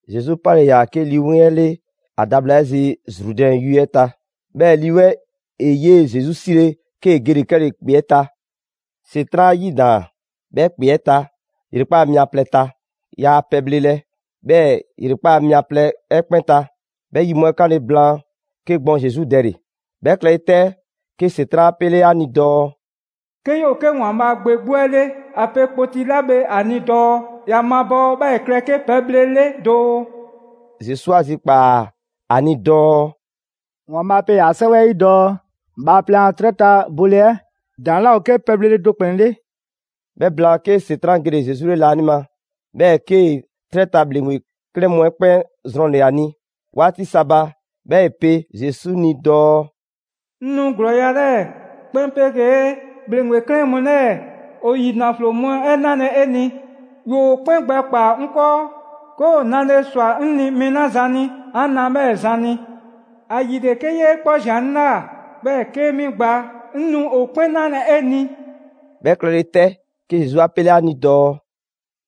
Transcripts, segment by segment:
Zesu 'pale‑ ‑yaa 'ke Lii 'Weŋ 'ɛ 'le ‑a da bhla 'ɛ zi Zrudɛn yue 'ɛ ta. 'Bhɛɛ‑ Lii 'Weŋ 'ɛ ‑e 'yee‑ Zesu 'sile 'kee‑ gele‑ 'kɛle‑ ‑kpe 'ɛ ta. ‑Setran' 'ɛ 'a 'yidaan‑ 'bhɛ ‑kpe 'ɛ ta ‑yrekpaa' mia plɛ ta. Yaa pɛbhlelɛ 'bhɛ ‑yrekpaa' mia plɛ 'ɛ 'kpɛn ta. 'Bhɛ yi mu 'ɛ 'kanle‑ blaan, 'ke gbɔn Zesu dɛle‑. 'Bhɛ klɛle 'tɛ, 'ke ‑Setran' 'a 'pele 'a ni dɔɔ: «'Ke 'yoo‑ 'ke ‑Waanbhaa' Gbe 'gbu 'ɛ 'le ‑a pe kpoti 'la bhe ‑a ni dɔɔ ‑ya mabɔɔ 'bhɛɛ‑ ‑e klɛ 'ke pɛbhle 'le doo.» Zesu 'a zikpaa꞊ ‑a ni dɔɔ: «‑Waanbhaa' pe ‑yaa' 'Sɛwɛ 'ɛ 'yi dɔɔ Bhaaplɛŋ a 'trɛ ta bole 'ɛ ‑daŋ' 'laa 'ke pɛbhlele do ‑kplɛn 'le.» 'Bhɛ blaan, 'ke ‑Setran' gele‑ 'ke Zesu 'le laanima, 'bhɛɛ‑ 'kee‑ 'trɛ ta ‑bhleŋgbe 'klɛɛn mu 'ɛ 'kpɛn zrɔnle‑ ‑a ni 'waati sa ba. 'Bhɛɛ‑ ‑e pe Zesu ni dɔɔ: «'Ŋ nu ‑glɔɔya' 'lɛɛ‑ 'kpɛn 'pegee ‑bhleŋgbe 'klɛɛn mu 'lɛɛ‑ ‑o ‑yi ‑naflo mu 'ɛ 'nalɛ‑ 'e ni. ‑Woo 'kpɛn gbɛkpaa‑ 'ŋ 'kɔɔ, 'ke ‑o nale ꞊swa 'ŋ ni mɛɛ 'la zan ni 'an na 'bhɛɛ‑ zan ni. ‑Ayile 'ke 'yee 'kpɔ꞊zian 'ŋ ꞊la, 'bhɛɛ‑ 'kee 'mi꞊gbaa, 'ŋ nu ‑o 'kpɛn 'nalɛ‑ 'e ni.» 'Bhɛ klɛle 'tɛ, 'ke Zesu 'a 'pele ‑a ni dɔɔ: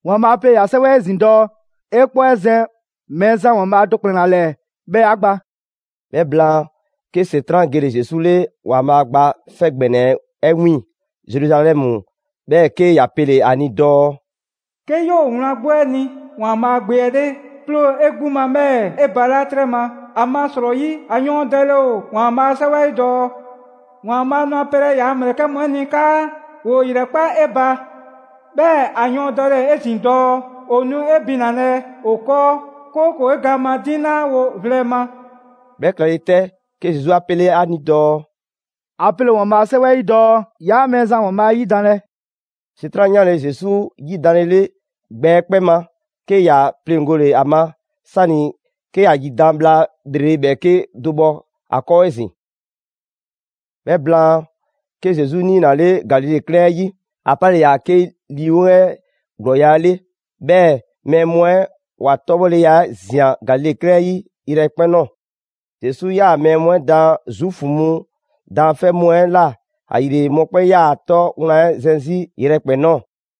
«‑Waanbhaa' pe ‑yaa' 'Sɛwɛ 'ɛ 'yi 'ezin‑ dɔɔ: ‹'E 'kpɔ 'ɛ zɛn Mɛɛzan ‑Waanbhaa' do ‑kplɛn ‑la ‑lɛɛ 'bhɛɛ‑ 'ya gba›.» 'Bhɛ blaan, 'ke ‑Setran' gele‑ Zesu 'le ‑Waanbhaa' Gba 'Fɛ ‑Gbɛnɛ 'ɛ 'wiiŋ‑ Zeruzalɛmu, 'bhɛɛ‑ 'ke ‑ya pele‑ ‑a ni dɔɔ: «'Ke 'yoo‑ wlan 'gbu 'ɛ ni ‑Waanbhaa' Gbe 'ɛ 'le, 'ploo‑ 'e 'gbu ma 'bhɛɛ‑ 'e balaa' 'trɛ ma. ‑Amasrɔyi ‑a yɔɔndɛle ‑o ‑Waanbhaa' a 'Sɛwɛ 'ɛ 'yi dɔɔ: ‹‑Waanbhaa' nu ‑a pelɛ ‑yaa' ‑mlɛkɛ' mu 'ɛ ni 'kaa ‑woo ‑yrɛkpa' 'e ba.› 'Bhɛɛ‑ ‑a yɔɔndɛle 'ezin‑ dɔɔ: ‹‑O nu 'e binalɛ ‑o 'kɔɔ, 'kooko‑ 'e gaan ma 'diŋ 'laa wo vlɛ ma.›» 'Bhɛ klɛle 'tɛ, 'ke Zesu 'a 'pele ‑a ni dɔɔ: «‑A pele ‑o ‑Waanbhaa' a 'Sɛwɛ 'ɛ 'yi dɔɔ: ‹'Yaa Mɛɛzan 'yaa‑ ‑Waanbhaa' 'ɛ ‑yidanlɛ.›» ‑Setran' 'yanle‑ Zesu 'yidanlele gbɛ 'ɛ 'kpɛn ma, 'ke ‑ya 'pleŋgole ‑a ma, 'sani‑ 'ke ‑a ‑yidan' bhla ‑lrele' ‑bhɛɛke' do bhɔ ‑a ‑kɔɔ 'ezin‑. 'Bhɛ blaan, 'ke Zesu 'niinale Galile 'klɛɛn 'ɛ 'yi. ‑A 'pale‑ ‑yaa 'ke Lii 'Weŋ 'ɛ ‑glɔɔya' 'le. 'Bhɛɛ‑ mɛɛ mu 'ɛ ‑wa 'tɔbhɔleya 'ɛ ꞊zian Galile 'klɛɛn 'ɛ 'yi yrɛkpɛn‑ ꞊nɔɔ. Zesu 'yaa‑ mɛɛ mu 'ɛ daan Zuufu mu daanfɛ' mu 'ɛ ꞊la. ‑Ayile mɔkpɛn' 'yaa‑ ‑a 'tɔ wlan 'ɛ zɛn 'zi yrɛkpɛn‑ ꞊nɔɔ.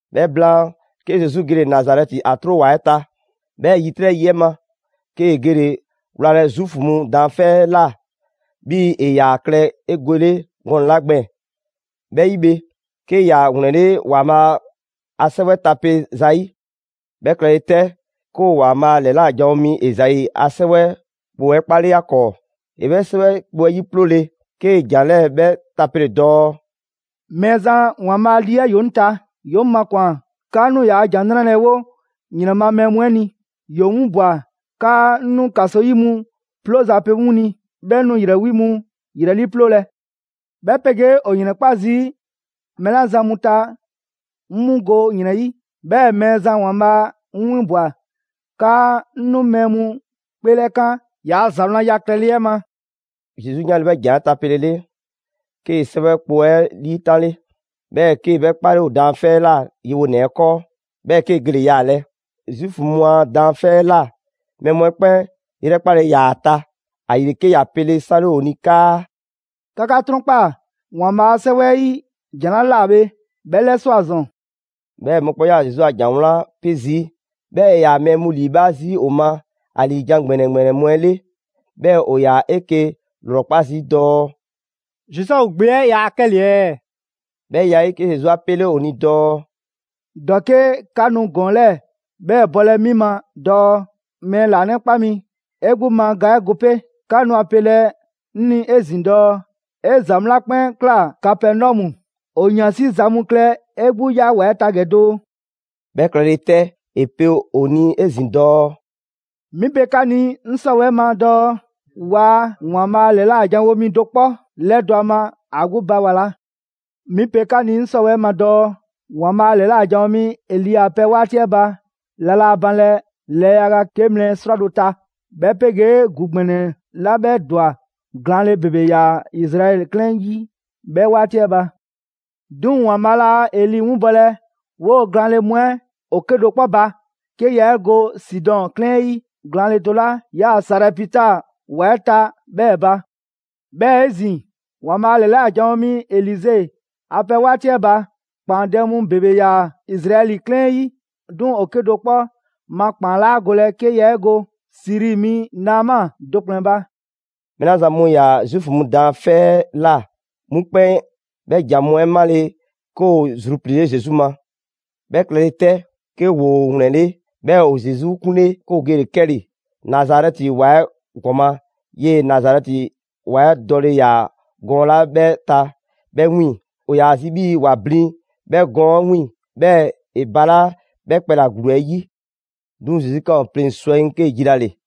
'Bhɛ blaan, 'ke Zesu gele‑ Nazarɛti, ‑a 'tro ‑wa 'ɛ ta. 'Bhɛɛ‑ ‑yitrɛ' yi 'ɛ ma, 'kee‑ gele‑ wlalɛ Zuufu mu daanfɛ' 'ɛ ꞊la, 'bhii‑ ‑e ‑yaa klɛ 'egwele gɔnɛ‑ 'la gbɛɛn‑. 'Bhɛ 'yi bhe, 'ke ‑ya ‑wlɛnle' ‑Waanbhaa' a 'Sɛwɛ tape zayi'. 'Bhɛ klɛle 'tɛ, 'ke ‑o ‑Waanbhaa' ‑lɛla' janwo mi Ezai a 'sɛwɛ kpo 'ɛ 'kpale ‑a ‑kɔɔ. ‑E 'bhɛ 'sɛwɛ kpo 'ɛ 'yiploole 'kee‑ ‑jan 'lɛɛ‑ 'bhɛ tapele dɔɔ: «Mɛɛzan ‑Waanbhaa' lii 'ɛ ‑yoo 'ŋ ta, ‑yoo 'ŋ makwan‑ 'kaa 'ŋ nu ‑yaa' ‑Jan 'Nrale‑ 'ɛ 'wo ‑yrɛn ma mɛɛ mu 'ɛ ni, ‑yoo 'ŋ 'winbwa‑ 'kaa 'ŋ 'nu ‑kaso 'yi mu 'plooza‑ pe 'mu ni, 'bhɛɛ‑ 'ŋ 'nu ‑yrɛ 'wi mu ‑yrɛ 'liiploo‑; 'bhɛ 'pegee ‑o ‑yrɛnkpa' zii' mɛɛ 'la zan mu ta 'ŋ 'mu go ‑yrɛn 'yi. 'Bhɛɛ‑ Mɛɛzan ‑Waanbhaa' 'ŋ 'winbwa‑ 'kaa 'ŋ nu mɛɛ mu 'kpeelɛkan ‑yaa' ‑za wlanya klɛle 'ɛ ma.» Zesu 'yanle‑ 'bhɛ ‑jan 'ɛ tapelele, 'kee‑ 'sɛwɛ kpo 'ɛ 'liitanle, 'bhɛɛ‑ 'kee‑ 'bhɛ 'kpale ‑o daanfɛ' 'ɛ ꞊la yewonɛ 'ɛ 'kɔɔ; 'bhɛɛ‑ 'kee‑ gele‑ yaalɛ. Zuufu mu a daanfɛ' 'ɛ ꞊la mɛɛ mu 'ɛ 'kpɛn 'yrɛkpale ‑yaa ‑a ta. ‑Ayile, 'ke ‑ya pele 'sanle ‑o ni 'kaa: «'Ka 'ka 'trɔnkpaa‑ ‑Waanbhaa' a 'Sɛwɛ 'ɛ 'yi ‑jan 'la ꞊la bhe, 'bhɛ 'lɛswa꞊ ‑zɔn.» 'Bhɛɛ‑ mɔkpɛn' 'yaa‑ Zesu a ‑jan 'wlan 'pe zii', 'bhɛɛ‑ ‑e ‑yaa mɛɛ mu ‑liibhaa' zii' ‑o ma ‑a ‑liijan' ‑gbɛnɛ ‑gbɛnɛ mu 'ɛ 'le. 'Bhɛɛ‑ ‑o yaa 'eke‑ ‑lrɔkpa' zii' dɔɔ: «Zozɛfu gbe 'ɛ yaa 'kɛle‑ ɛɛ?» 'Bhɛ ya 'ɛ 'yi, 'ke Zesu 'a 'pele ‑o ni dɔɔ: «‑Dɔke' 'ka nu ‑gɔɔn 'lɛɛ‑ 'bhɛ bɔlɛ 'mi ma dɔɔ: ‹Mɛɛ ‑laanɛkpa mi, 'e 'gbu ma ga 'ɛ go 'pe.› 'Ka nu ‑a pelɛ 'ŋ ni 'ezin‑ dɔɔ: ‹'E ‑za mu 'la 'kpɛn ꞊kla Kapɛnɔmu, ‑o ‑yansi' za mu klɛ 'e 'gbu 'ya ‑wa 'ɛ ta ‑gɛ doo.›» 'Bhɛ klɛle 'tɛ, ‑e pe ‑o ni 'ezin‑ dɔɔ: «'Mi pe 'ka ni 'ŋ 'sɔwɛɛ‑ ma dɔɔ waa ‑Waanbhaa' ‑lɛla' janwo mi do 'kpɔ 'lɛdɔ‑ ‑a ma ‑a 'gbu ba ‑wa ‑la. 'Mi pe 'ka ni 'ŋ 'sɔwɛɛ‑ ma dɔɔ: ‑Waanbhaa' ‑lɛla' janwo mi Eli a pɛ 'waati 'ɛ ba, la laa banlɛ lɛɛ yaga 'ke mlɛ 'srwado‑ ta, 'bhɛ 'pegee ‑gu ‑gbɛnɛ 'la 'bhɛ ‑dwa, glaanle ‑bebe ‑yaa Izraɛli 'klɛɛn 'yi 'bhɛ 'waati 'ɛ ba. 'Duŋ‑ ‑Waanbhaa' laa Eli 'winbɔlɛ 'woo‑ glaanle mu 'ɛ ‑o 'kedo‑ 'kpɔ ba, 'ke yaa 'e go Sidɔn 'klɛɛn 'ɛ 'yi glaanle do 'la 'yaa‑ Sarɛpita ‑wa 'ɛ ta 'bhɛɛ‑ ba. 'Bhɛɛ‑ 'ezin‑ ‑Waanbhaa' ‑lɛla' janwo mi Elize a pɛ 'waati 'ɛ ba, ‑kpaandɛ' mu ‑bebe ‑yaa Izraɛli 'klɛɛn 'yi, 'duŋ‑ ‑o 'kedo‑ 'kpɔ ma ‑kpaan 'laa golɛ 'ke yaa 'e go Siri mi Naama do ‑kplɛn ba.» Mɛɛ 'la zan mu ‑yaa Zuufu mu daanfɛ' 'ɛ ꞊la, 'mu 'kpɛn 'bhɛ ‑jan mu 'ɛ 'male, 'ke ‑woo zrupliile Zesu ma. 'Bhɛ klɛle 'tɛ, 'ke ‑woo ‑wlɛnle'. 'Bhɛɛ‑ ‑o Zesu 'kunle‑ 'ke ‑o gele‑ 'kɛle‑ Nazarɛti ‑wa 'ɛ ‑gɔma', 'yee‑ Nazarɛti ‑wa 'ɛ dɔle ‑yaa gɔɔn 'la 'bhɛ ta 'bhɛ 'wiiŋ‑. ‑O ‑yaa zi 'bhii‑ ‑wa blin 'bhɛ gɔɔn 'ɛ 'wiiŋ‑, 'bhɛɛ‑ ‑e balaa' 'bhɛ kpɛla‑ ‑gluu 'ɛ 'yi. 'Duŋ‑ Zesu ꞊kaan ‑o pleŋ‑ swɛŋ 'kee‑ jilale.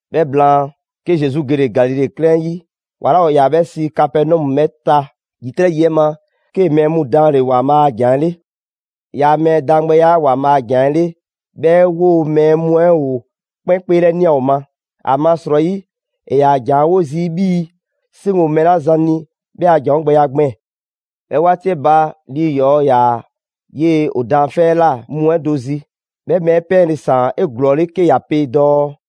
'Bhɛ blaan, 'ke Zesu gele‑ Galile 'klɛɛn 'yi ‑wa 'la ‑o ‑yaa 'bhɛ sii Kapɛnɔmu 'bhɛ ta. ‑Yitrɛ' yi 'ɛ ma, 'kee‑ mɛɛ mu daanle‑ ‑Waanbhaa' a ‑jan 'ɛ 'le. ‑Yaa' mɛɛ daangbɛya 'ɛ ‑Waanbhaa' a ‑jan 'ɛ 'le, 'bhɛ 'woo‑ mɛɛ mu 'ɛ ‑o 'kpɛn 'kpeelɛnia ‑o ma. ‑Amasrɔyi ‑e ‑yaa ‑jan 'ɛ 'wo zii' 'bhii‑ 'seŋ ‑o mɛɛ 'la zan ni 'bhɛ a ‑janwogbɛya gbɛɛn‑. 'Bhɛ 'waati 'ɛ ba, lii ‑yɔɔ' 'yaa‑ 'yee‑ ‑o daanfɛ' 'ɛ ꞊la mu 'ɛ do zi. 'Bhɛ mɛɛ 'ɛ 'pɛɛnle‑ ‑saan 'eglɔɔle 'ke ‑ya pe dɔɔ: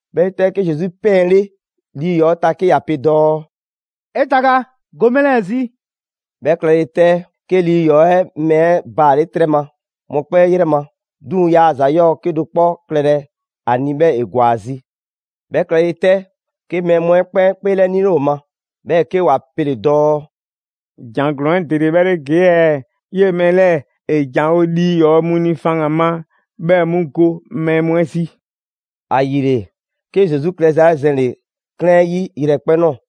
'Bhɛ 'yi 'tɛ, 'ke Zesu 'pɛɛnle lii ‑yɔɔ' 'ɛ ta 'ke ‑ya pe dɔɔ: «'E taga, go mɛɛ 'lɛɛ‑ zi!» 'Bhɛ klɛle 'tɛ, 'ke lii ‑yɔɔ' 'ɛ mɛɛ 'ɛ baale' 'trɛ ma mɔkpɛn' 'yrɛ ma. 'Duŋ‑ yaa ‑za 'yɔɔ‑ 'kedo‑ 'kpɔ klɛlɛ ‑a ni, 'bhɛɛ‑ ‑e ‑gwa ‑a zi. 'Bhɛ klɛle 'tɛ, 'ke mɛɛ mu 'ɛ 'kpɛn 'kpeelɛnile ‑o ma. 'Bhɛɛ‑ 'ke ‑wa pele‑ dɔɔ: «‑Jan ‑glɔɔn 'ɛ ‑dele 'bhɛ 'le ‑gee' ɛɛ? 'Yee‑ mɛɛ 'lɛɛ‑ ‑e ‑janwo' lii ‑yɔɔ' mu ni faŋgan‑ ma, 'bhɛɛ‑ 'mu go mɛɛ mu 'ɛ zi.» ‑Ayile, 'ke Zesu klɛza 'ɛ zɛnle‑ 'klɛɛn 'ɛ 'yi yrɛkpɛn‑ ꞊nɔɔ.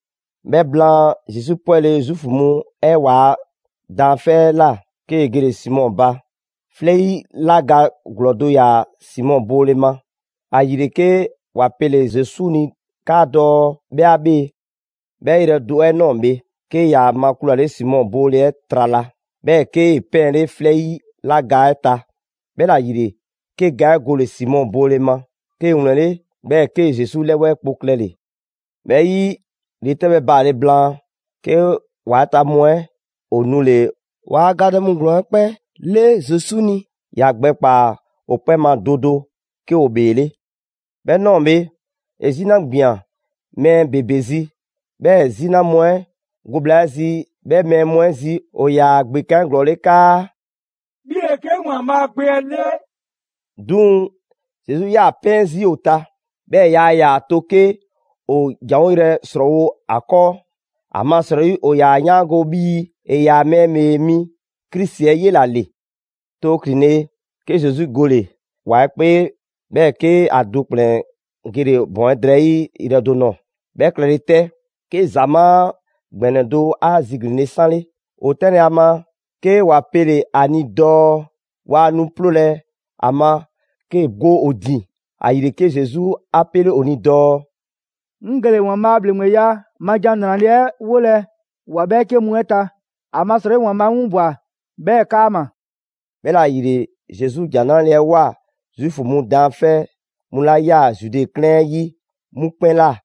'Bhɛ blaan, Zesu 'pwɛle‑ Zuufu mu 'ɛ waa daanfɛ' 'ɛ ꞊la, 'kee‑ gele‑ Simɔ ba. 'Flɛ 'yi 'la ga ‑glɔɔ do ‑yaa Simɔ boole ma. ‑Ayile, 'ke ‑wa pele‑ Zesu ni 'kaadɔɔ‑ 'bhɛ 'a 'bhee‑. 'Bhɛ yrɛ do 'ɛ ꞊nɔɔ bhe, 'ke ‑ya makulale Simɔ boole 'ɛ trala, 'bhɛɛ‑ 'kee‑ 'pɛɛnle 'flɛ 'yi 'la ga 'ɛ ta. 'Bhɛla‑ ‑yile, 'ke ga 'ɛ gole‑ Simɔ boole ma. 'Kee‑ ‑wlɛnle', 'bhɛɛ‑ 'kee‑ Zesu 'lɛwɛɛ kpo klɛle‑. 'Bhɛ 'yi, ‑yretɛbhɛ baale blaan, 'ke ‑wa 'ɛ ta mu 'ɛ ‑o nule‑ ‑waa gadɛ mu ‑glɔɔn 'ɛ 'kpɛn 'le Zesu ni. ‑Ya gbɛkpaa‑ ‑o 'kpɛn ma do do 'ke ‑o ‑bheele'. 'Bhɛ ꞊nɔɔ bhe, ‑e 'zina ꞊gbian mɛɛ ‑bebe zi. 'Bhɛɛ‑ 'zina mu 'ɛ go bhla 'ɛ zi 'bhɛ mɛɛ mu 'ɛ zi, ‑o ‑yaa ‑gbekan' 'eglɔɔle 'kaa: «'Bhi ‑le 'ke ‑Waanbhaa' Gbe 'ɛ 'le!» 'Duŋ‑ Zesu 'yaa‑ 'pɛɛn zii' ‑o ta, 'bhɛɛ‑ yaa ‑yaa to 'ke ‑o ‑janwoyrɛ ‑srɔɔwo' ‑a 'kɔɔ, ‑amasrɔyi ‑o ‑yaa 'yaango 'bhii‑ ‑e ‑yaa Mɛɛ ‑Bhee Mi Krisi 'ɛ 'yela‑ ‑le. Too ‑klinle', 'ke Zesu gole‑ ‑wa 'ɛ 'kpee, 'bhɛɛ‑ 'ke ‑a do ‑kplɛn gele‑ ‑bɔn 'ɛ drɛyi' yrɛ do nɔɔ‑. 'Bhɛ klɛle 'tɛ, 'ke ‑zamaa' ‑gbɛnɛ do 'a ziglinle 'sanle. ‑O 'tɛnlɛ‑ ‑a ma, 'ke ‑wa pele‑ ‑a ni dɔɔ waa nu 'ploolɛ ‑a ma 'kee go ‑o ‑din. ‑Ayile, 'ke Zesu 'a 'pele ‑o ni dɔɔ: «'Ŋ gele‑ ‑Waanbhaa' a ‑bhleŋgbeya ma ‑Jan 'Nrale‑ 'ɛ 'wolɛ‑ ‑wa 'bhɛɛke mu 'ɛ ta. ‑Amasrɔyi ‑Waanbhaa' 'ŋ 'winbwa‑ 'bhɛɛ‑ 'kaama‑.» 'Bhɛla‑ ‑yile, Zesu ‑Jan 'Nrale‑ 'ɛ ꞊woa Zuufu mu daanfɛ' mu 'la 'yaa‑ Zude 'klɛɛn 'ɛ 'yi 'mu 'kpɛn ꞊la.